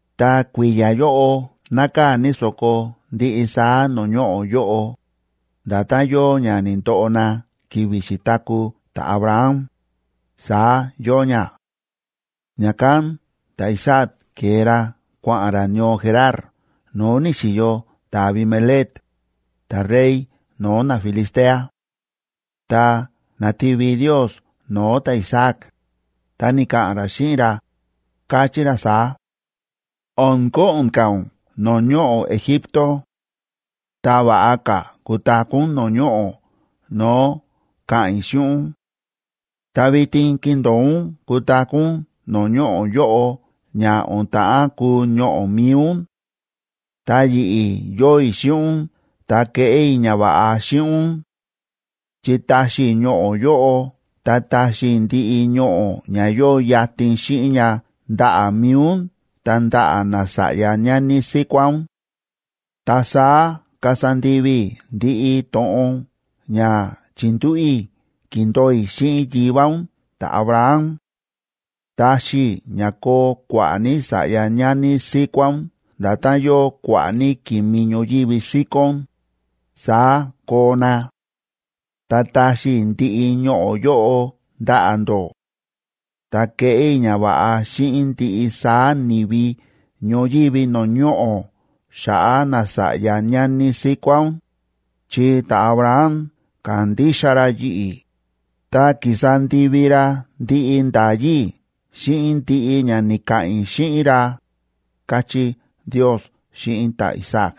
Ta kui̱ya̱ yóꞌo nákaa̱ ní so̱ko ndiꞌi saá no̱o̱ ñoꞌo̱ yóꞌo, nda̱tán yóo ña ni̱ndoꞌo na ki̱vi̱ xi̱taku̱ ta̱Abraham, saá yóo ña. Ña̱kán ta̱Isaac ke̱e ra kua̱ꞌa̱n ra ñoo Gerar no̱o̱ ni̱xi̱yo ta̱Abimelec, ta̱rey no̱o̱ naFilistea. Ta na̱ti̱vi Ndiosa no̱o̱ ta̱Isaac, ta ni̱ka̱ꞌa̱n ra xíꞌin ra, káchí ra saá: ―O̱n ko̱ꞌo̱n ka̱ ún no̱o̱ ñoꞌo̱ Egipto. Ta va̱ꞌa ka̱ kutaku̱ ún no̱o̱ ñoꞌo̱ no̱o̱ ka̱ꞌa̱n i̱ xíꞌin ún. Ta vitin kindo̱o ún kutaku̱ ún no̱o̱ ñoꞌo̱ yóꞌo ña o̱n ta̱ꞌán kuu ñoꞌo̱ mi̱i ún. Ta yi̱ꞌi̱ yóo i̱ xíꞌin ún ta keꞌé i̱ ñava̱ꞌa xíꞌin ún. Chi taxi i̱ ñoꞌo̱ yóꞌo ta taxi i̱ ndiꞌi ñoꞌo̱ ña yóo yatin xíꞌin ña ndaꞌa̱ mi̱i ún ta ndaꞌa̱ nasa̱ꞌya ñani síkuá ún. Ta saá kasa ndivi i̱ ndiꞌi to̱ꞌon ña chi̱ndúꞌu̱ i̱ ki̱ndo̱o i̱ xíꞌin yivá ún ta̱Abraham. Taxi i̱ ña koo kua̱ꞌa̱ ní sa̱ꞌya ñani síkuá ún nda̱tán yóo kua̱ꞌa̱ ní ki̱mi ñoyívi síkón, saá koo na. Ta taxi i̱ ndiꞌi ñoꞌo̱ yóꞌo ndaꞌa̱ ndó. Ta keꞌé i̱ ñava̱ꞌa xíꞌin ndiꞌi saá ni̱vi ñoyívi no̱o̱ ñoꞌo̱ xa̱ꞌa̱ nasa̱ꞌya ñani síkuá ún, chi ta̱Abraham ka̱ndixa ra yi̱ꞌi̱, ta ki̱sa ndivi ra ndiꞌi nda̱yí i̱ xíꞌin ndiꞌi ña ni̱ka̱ꞌa̱n i̱ xíꞌin ra ―káchí Ndios xíꞌin ta̱Isaac.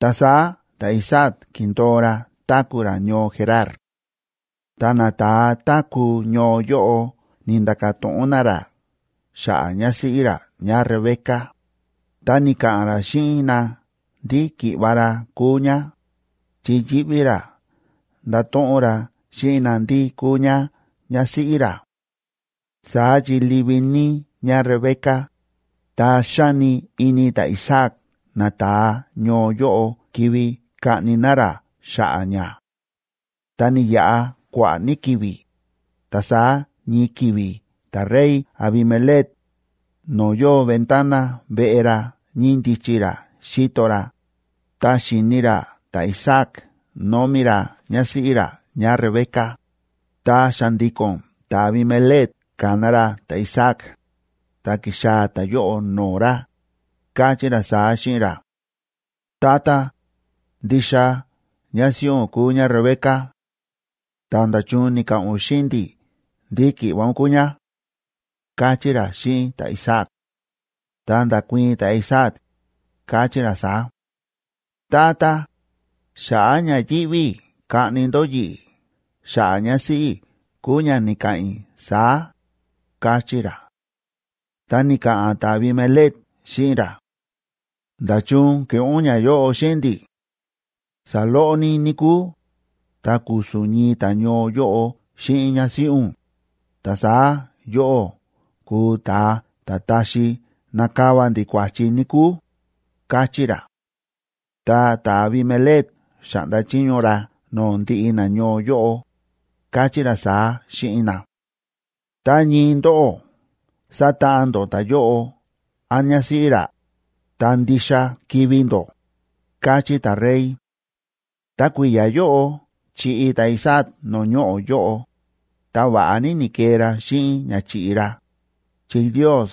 Ta saá ta̱Isaac ki̱ndo̱o ra táku̱ ra ñoo Gerar. Ta nata̱a táku̱ ñoo yóꞌo ni̱nda̱ka̱ to̱ꞌon na ra xa̱ꞌa̱ ñásíꞌí ra ñáRebeca, ta ni̱ka̱ꞌa̱n ra xíꞌin na ndí ki̱ꞌva̱ ra kúu ñá, chi yíꞌví ra ndato̱ꞌon ra xíꞌin na ndí kúu ñá ñásíꞌí ra. Saá chi livi ní ñáRebeca, ta xáni ini ta̱Isaac nata̱a ñoo yóꞌo kivi kaꞌni na ra xa̱ꞌa̱ ñá. Ta ni̱yaꞌa kua̱ꞌa̱ ní ki̱vi̱, ta saá ñii ki̱vi̱ ta̱rey Abimelec no̱o̱ yóo ventana veꞌe ra ñíndichi ra xíto ra, ta xi̱ni ra ta̱Isaac nómi ra ñásíꞌí ra ñáRebeca. Ta xa̱ndi̱ko̱n ta̱Abimelec ka̱na ra ta̱Isaac, ta ki̱xaa̱ ta̱yóꞌo no̱o̱ ra, káchí ra saá xíꞌin ra: ―Tata, ndixa ñásíꞌí ún kúu ñáRebeca. Ta, ¿nda̱chun ni̱ka̱ꞌa̱n ún xíꞌin ndi̱ ndí ki̱ꞌva̱ ún kúu ñá? ―káchí ra xíꞌin ta̱Isaac. Ta nda̱kuii̱n ta̱Isaac, káchí ra saá: ―Tata, xa̱ꞌa̱ ña yíꞌví i̱ kaꞌni ndó yi̱ꞌi̱ xa̱ꞌa̱ ñásíꞌí i̱ kúu ña ni̱ka̱ꞌa̱n i̱ saá ―káchí ra. Ta ni̱ka̱ꞌa̱n ta̱Abimelec xíꞌin ra: ―¿Nda̱chun ke̱ꞌé ún ñayóꞌo xíꞌin ndi̱? Saloꞌo ní níkúu, ta ku̱su̱n ñii ta̱ñoo yóꞌo xíꞌin ñásíꞌí ún, ta saá yóꞌó kuu ta̱a ta̱ taxi nakava ndi̱ kua̱chi, níkúu ―káchí ra. Ta ta̱Abimelec xa̱ꞌnda chiño ra no̱o̱ ndiꞌi nañoo yóꞌo, káchí ra saá xíꞌin na: ―Tá ñii ndóꞌó satáꞌan ndó ta̱yóꞌo án ñásíꞌí ra, ta ndixa kivi̱ ndó ―káchí ta̱rey. Ta kui̱ya̱ yóꞌo chi̱ꞌi ta̱Isaac no̱o̱ ñoꞌo̱ yóꞌo, ta va̱ꞌa ní ni̱kee ra xíꞌin ña chi̱ꞌi ra, chi Ndios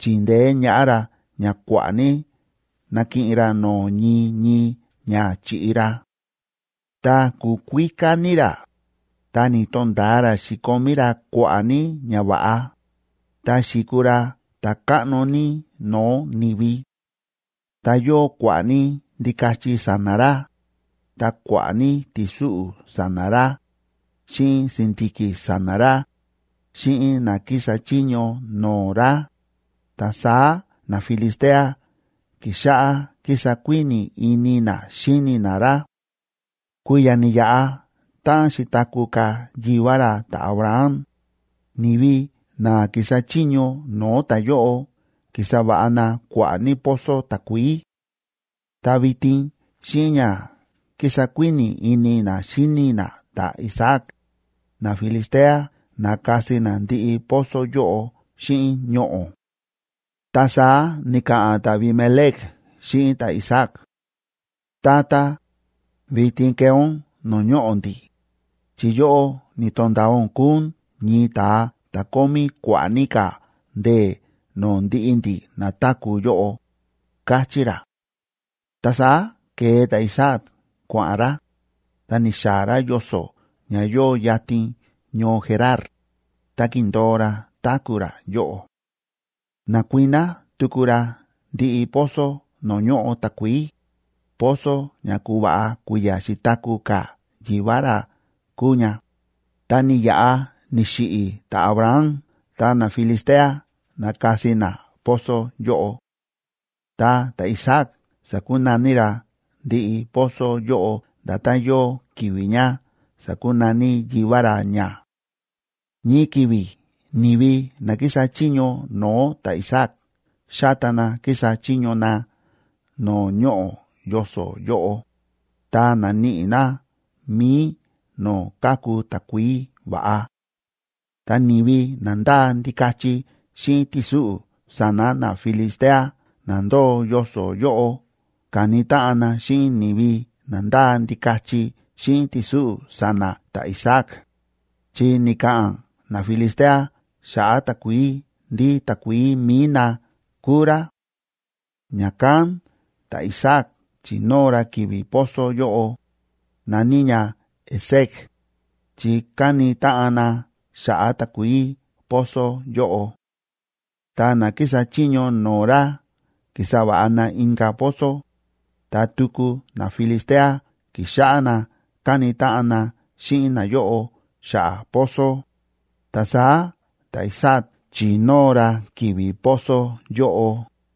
chi̱ndeé ñaꞌá ra ña kua̱ꞌa̱ ní na̱kiꞌin ra no̱o̱ ñii ñii ña chi̱ꞌi ra. Ta ku̱kuíká ní ra, ta ni̱to̱nda̱a ra xi̱komí ra kua̱ꞌa̱ ní ñava̱ꞌa, ta xi̱kuu ra ta̱káꞌno ní no̱o̱ ni̱vi. Ta yóo kua̱ꞌa̱ ní ndikachi sa̱na̱ ra, ta kua̱ꞌa̱ ní ti̱súꞌu̱ sa̱na̱ ra, xíꞌin si̱ndi̱ki̱ sa̱na̱ ra, xíꞌin na kísa chiño no̱o̱ ra, ta saá naFilistea ki̱xáꞌá kísa kuíni̱ ini na xíni na ra. Kui̱ya̱ ni̱yaꞌa táꞌan xi̱taku̱ ka̱ yivá ra ta̱Abraham, ni̱vi na ki̱sa chiño no̱o̱ ta̱yóꞌo ki̱sa va̱ꞌa na kua̱ꞌa̱ ní pozo takuií. Ta vitin xíꞌin ña kísa kuíni̱ ini na xíni na ta̱Isaac, naFilistea na̱kasi na ndiꞌi pozo yóꞌo xíꞌin ñoꞌo̱. Ta saá ni̱ka̱ꞌa̱n ta̱Abimelec xíꞌin ta̱Isaac: ―Tata, vitin kee ún no̱o̱ ñoꞌo̱ ndi̱, chi yóꞌó ni̱to̱nda̱a ún kúu ún ñii ta̱a ta̱ kómí kua̱ꞌa̱ ní ka̱ ndee̱ no̱o̱ ndiꞌi ndi̱ na táku̱ yóꞌo ―káchí ra. Ta saá ke̱e ta̱Isaac kua̱ꞌa̱n ra, ta ni̱xaa̱ ra yoso̱ ña yóo yatin ñoo Gerar, ta ki̱ndo̱o ra táku̱ ra yóꞌo. Na̱kuiná tuku ra ndiꞌi pozo no̱o̱ ñóꞌo takuií, pozo ña ku̱va̱ꞌa kui̱ya̱ xi̱taku̱ ka̱ yivá ra kúu ña, ta ni̱yaꞌa ni̱xiꞌi̱ ta̱Abraham ta naFilistea na̱kasi na pozo yóꞌo. Ta ta̱Isaac sa̱kunaní ra ndiꞌi pozo yóꞌo nda̱tán yóo ki̱vi̱ ña sa̱kunaní yivá ra ña. Ñii ki̱vi̱ ni̱vi na kísa chiño no̱o̱ ta̱Isaac xáta na kísa chiño na no̱o̱ ñoꞌo̱ yoso̱ yóꞌo, ta na̱níꞌi na mi̱i no̱o̱ káku takuií va̱ꞌa. Ta ni̱vi na ndáa ndikachi xíꞌin ti̱súꞌu̱ sa̱na̱ naFilistea na ndóo yoso̱ yóꞌo ka̱ni táꞌan na xíꞌin ni̱vi na ndáa ndikachi xíꞌin ti̱súꞌu̱ sa̱na̱ ta̱Isaac, chi ni̱ka̱ꞌa̱n naFilistea xa̱ꞌa̱ takuií ndí takuií mi̱i na kúu rá. Ña̱kán ta̱Isaac chi̱nóo ra ki̱vi̱ pozo yóꞌo, na̱ní ña Esek,b chi káni táꞌan na xa̱ꞌa̱ takuií pozo yóꞌo. Ta na kísa chiño no̱o̱ ra ki̱sa va̱ꞌa na inka̱ pozo, ta tuku naFilistea ki̱xáꞌá na káni táꞌan na xíꞌin nayóꞌo xa̱ꞌa̱ pozo, ta saá ta̱Isaac chi̱nóo ra ki̱vi̱ pozo yóꞌo,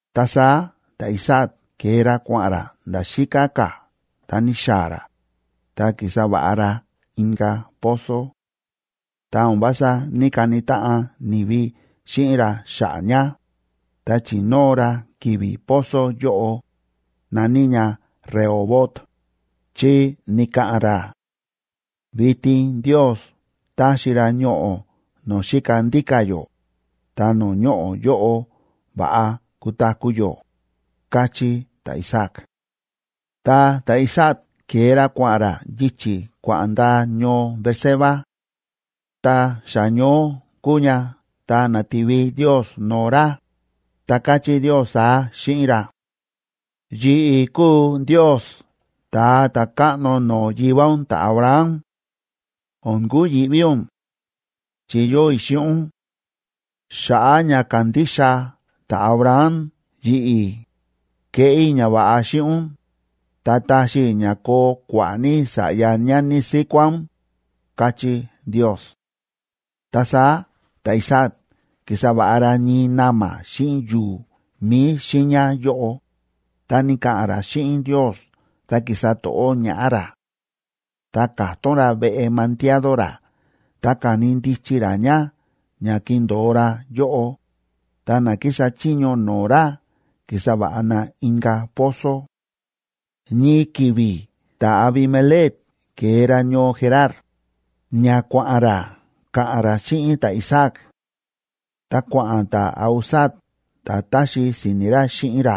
Ta saá ta̱Isaac ke̱e ra kua̱ꞌa̱n ra nda̱ xíká ka̱, ta ni̱xaa̱ ra, ta ki̱sa va̱ꞌa ra inka̱ pozo. Ta o̱n vása ní‑kani táꞌan ni̱vi xíꞌin ra xa̱ꞌa̱ ña, ta chi̱nóo ra ki̱vi̱ pozo yóꞌo, na̱ní ña Rehobot,d chi ni̱ka̱ꞌa̱n ra: “Vitin Ndios táxi ra ñoꞌo̱ no̱o̱ xíka ndíka̱ yó, ta no̱o̱ ñoꞌo̱ yóꞌo va̱ꞌa kutaku̱ yó”, káchí ta̱Isaac. Ta ta̱Isaac ke̱e ra kua̱ꞌa̱n ra yichi̱ kua̱ꞌa̱n ndaa ñoo Beerseba. Ta xa ñoó kúu ña ta na̱ti̱vi Ndios no̱o̱ ra, ta káchí Ndios saá xíꞌin ra: Yi̱ꞌi̱ kúu Ndios ta̱a ta̱káꞌno no̱o̱ yivá ún ta̱Abraham. O̱n kuyi̱ꞌví ún, chi yóo i̱ xíꞌin ún. Xa̱ꞌa̱ ña ka̱ndixa ta̱Abraham yi̱ꞌi̱, keꞌé i̱ ñava̱ꞌa xíꞌin ún, ta taxi i̱ ña koo kua̱ꞌa̱ ní sa̱ꞌya ñani síkuá ún, káchí Ndios. Ta saá ta̱Isaac ki̱sa va̱ꞌa ra ñii na̱ma̱ xíꞌin yu̱u̱ mi̱i xiiña yóꞌo, ta ni̱ka̱ꞌa̱n ra xíꞌin Ndios ta ki̱sa to̱ꞌó ñaꞌá ra. Ta ka̱tón ra veꞌe mandiado ra ta ka̱ni ndichi ra ña ña kindo̱o ra yóꞌo, ta na kísa chiño no̱o̱ ra ki̱sa va̱ꞌa na inka̱ pozo. Ñii ki̱vi̱ ta̱Abimelec ke̱e ra ñoo Gerar, ña kua̱ꞌa̱n ra ka̱ꞌa̱n ra xíꞌin ta̱Isaac. Ta kua̱ꞌa̱n ta̱Ahuzat ta̱ táxi si̱ni̱ ra xíꞌin ra,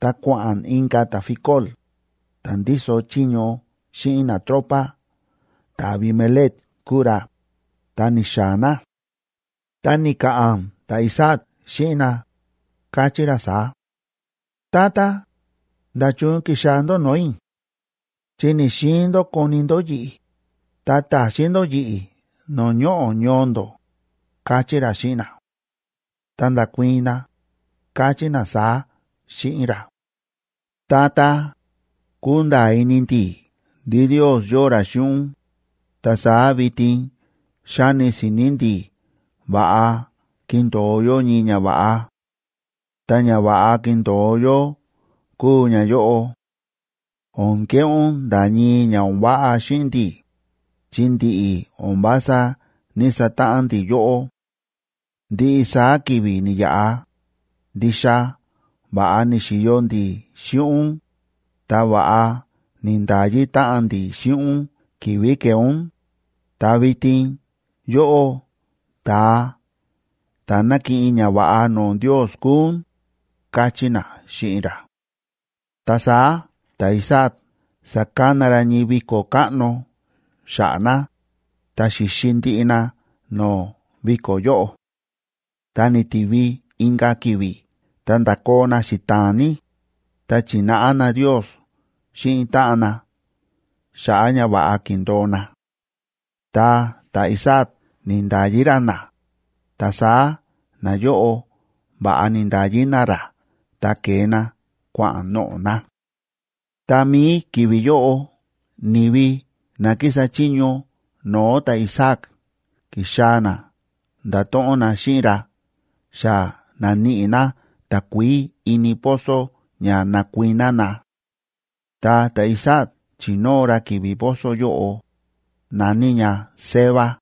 ta kua̱ꞌa̱n inka̱ ta̱Ficol, ta̱ ndíso chiño xíꞌin natropa ta̱Abimelec kúu ra, ta ni̱xaa̱ na. Ta ni̱ka̱ꞌa̱n ta̱Isaac xíꞌin na, káchí ra saá: ―Tata, ¿nda̱chun ki̱xaa̱ ndó no̱o̱ i̱?, chi ni̱‑xiin ndó koni ndó yi̱ꞌi̱, ta ta̱xín ndó yi̱ꞌi̱ no̱o̱ ñoꞌo̱ ñoo ndó ―káchí ra xíꞌin na. Ta nda̱kuii̱n na, káchí na saá xíꞌin ra: ―Tata, kúnda̱a̱ ini ndi̱ ndí Ndios yóo ra xíꞌin ún, ta saá vitin xáni si̱ni̱ ndi̱ va̱ꞌa kindo̱o yó ñii ñava̱ꞌa. Ta ñava̱ꞌa kindo̱o yó kúu ñayóꞌo: O̱n keꞌé ún nda̱ ñii ña o̱n váꞌa xíꞌin ndi̱, chi ndi̱ꞌi̱ o̱n vása ní‑satáꞌan ndi̱ yóꞌó. Ndiꞌi saá ki̱vi̱ ni̱yaꞌa, ndixa va̱ꞌa ni̱xi̱yo ndi̱ xíꞌin ún, ta va̱ꞌa ni̱nda̱yi táꞌan ndi̱ xíꞌin ún ki̱vi̱ ke̱e ún, ta vitin yóꞌó ta̱a ta̱ nákiꞌin ñava̱ꞌa no̱o̱ Ndios kúu ún ―káchí na xíꞌin ra. Ta saá ta̱Isaac sa̱kana ra ñii viko̱ káꞌno xa̱ꞌa̱ na, ta xi̱xi ndiꞌi na no̱o̱ viko̱ yóꞌo. Ta ni̱ti̱vi inka̱ ki̱vi̱ ta nda̱koo na xita̱a̱n ní, ta chi̱náꞌa na Ndios xíꞌin táꞌan na xa̱ꞌa̱ ñava̱ꞌa ki̱ndo̱o na. Ta ta̱Isaac ni̱nda̱yi ra na, ta saá nayóꞌo va̱ꞌa ni̱nda̱yi na ra ta ke̱e na kua̱ꞌa̱n noꞌo̱ na. Tá mií ki̱vi̱ yóꞌo ni̱vi na kísa chiño no̱o̱ ta̱Isaac ki̱xaa̱ na nda̱to̱ꞌon na xíꞌin ra xa na̱níꞌi na takuií ini pozo ña na̱kuiná na. Ta ta̱Isaac chi̱nóo ra ki̱vi̱ pozo yóꞌo, na̱ní ña Seba.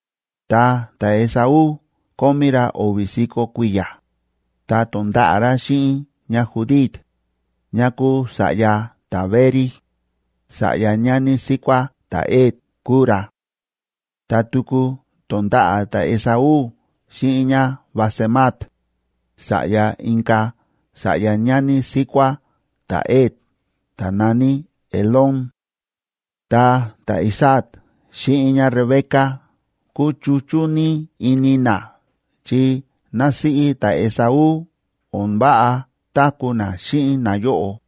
Ta ta̱Esaú kómí ra o̱vi̱ si̱ko̱ kui̱ya̱, ta to̱nda̱ꞌa̱ ra xíꞌin ñáJudit, ñá kúu sa̱ꞌya ta̱Beeri, sa̱ꞌya ñani síkuá ta̱Het kúu ra. Ta tuku to̱nda̱ꞌa̱ ta̱Esaú xíꞌin ñáBasemat, sa̱ꞌya inka̱ sa̱ꞌya ñani síkuá ta̱Het ta̱ na̱ní Elón. Ta ta̱Isaac xíꞌin ñáRebeca kúchuchú ní ini na chi násíꞌí ta̱Esaú o̱n váꞌa táku̱ ná xíꞌin nayóꞌo.